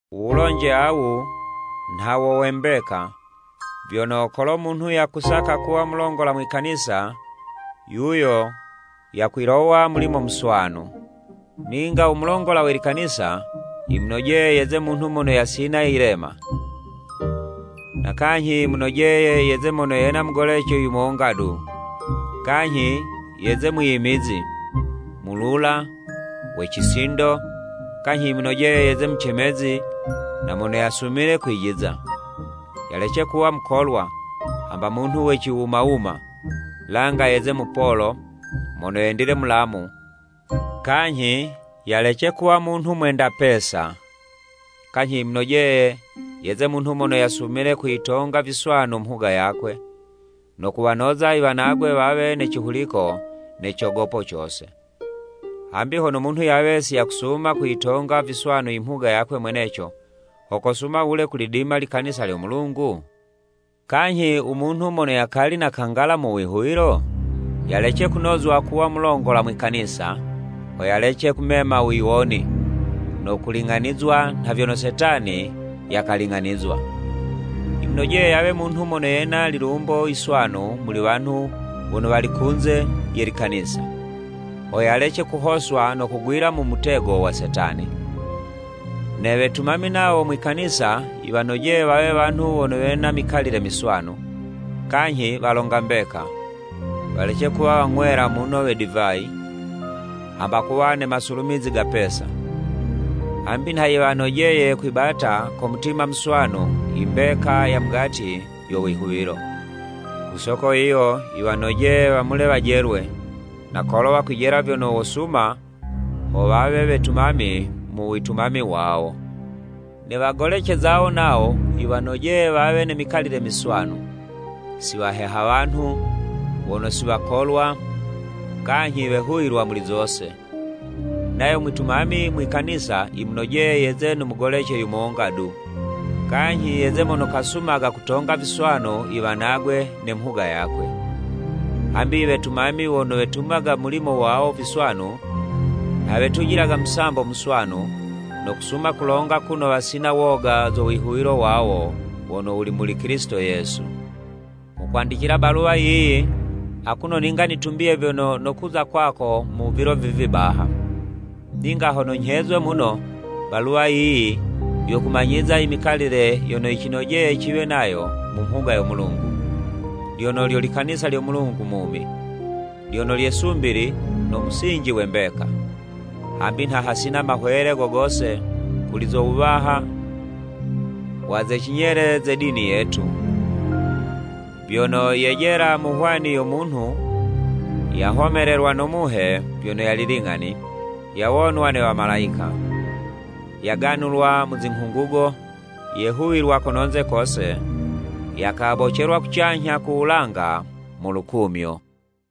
Uwulonje awu, nha wo we mbeka: vyono kolo munhu yakusaka kuwa mulongola mwi kanisa, yuyo yakwilowa mulimo muswanu. Ninga u mulongola we likanisa, yimunojeye yeze munhu mono yasina yilema, na kanyhi yimunojeye yeze mono yena mugolece yumonga du, kanyhi yeze mwiyimizi, mulula, we cisindo, kanyhi yimunojeye yeze mucemezi na mono yasumile kwijiza, yalece kuwa mukolwa, hamba munhu we ciwuma wuma, langa yeze mupolo, mono yendile mulamu, kanyhi yalece kuwa munhu mwenda pesa, kanyhi yimunojeye yeze munhu mono yasumile kuyitonga viswanu mhuga yakwe, no kuwanoza i wanagwe wawe ne cihuliko ne cogopo cose. Hambi hono munhu yawe si yakusuma kuyitonga viswanu i mhuga yakwe mweneco, ho kosuma wule kulidima likanisa lyo Mulungu? Kanyhi u munhu mono yakali nakangala mu wihuwilo, yalece kunozwa kuwa mulongola mwi kanisa, ho yalece kumema wiwoni, no kuling'anizwa nha vyono Setani yakaling'anizwa. Yimunojeye yawe munhu mono yena lilumbo yiswanu muli wanhu wono wali kunze ye likanisa, ho yalece kuhoswa no kugwila mu mutego wa Setani Ne wetumami nawo mwi kanisa yiwanojeye wawe wanhu wono wena mikalile miswanu, kanyhi walonga mbeka, walece kuwa wang'wela muno we divayi, hamba kuwa ne masulumizi ga pesa, hambi nha yiwanojeye kwibata ko mutima muswanu imbeka ya mugati yo wihuwilo. Ku soko yiyo, yiwanojeye wamule wajelwe, na kolo wakwijela vyono wosuma, ho wawe wetumami mu witumami wawo. Ne wagolece zawo nawo, yiwanojeye wawe ne mikalile miswanu, si waheha wanhu, wono si wakolwa, kanyhi wehuwilwa muli zose. Nayo mwitumami mwi kanisa yimunojeye yeze no mugolece yumonga du, kanyhi yeze mono kasumaga kutonga viswanu iwanagwe ne mhuga yakwe. Hambi i wetumami wono wetumaga mulimo wawo viswanu, nha wetujilaga musambo muswanu, no kusuma kulonga kuno wasina woga zo wihuwilo wawo wono wuli muli Kilisito Yesu. Nghukwandicila baluwa yiyi, akuno ninga nitumbiye vyono nokuza kwako mu vilo vivi baha. Ninga hono nyhezwe muno, baluwa yiyi yokumanyiza imikalile yono yicinojeye ciwe nayo mu mhuga yo Mulungu, lyono lyo likanisa lyo Mulungu mumi, lyono lye 'sumbili no musinji we mbeka. Hambi nha hasina mahwele go gose kuli zo wuwaha wa ze cinyele ze dini yetu, vyono: Yejela mu hwani yo munhu yahomelelwa no Muhe vyono yali ling'ani, yawonwa ne wamalayika. Yaganulwa mu zinghungugo, yehuwilwa kononze kose, yakabocelwa kucanyha ku wulanga mu lukumyo.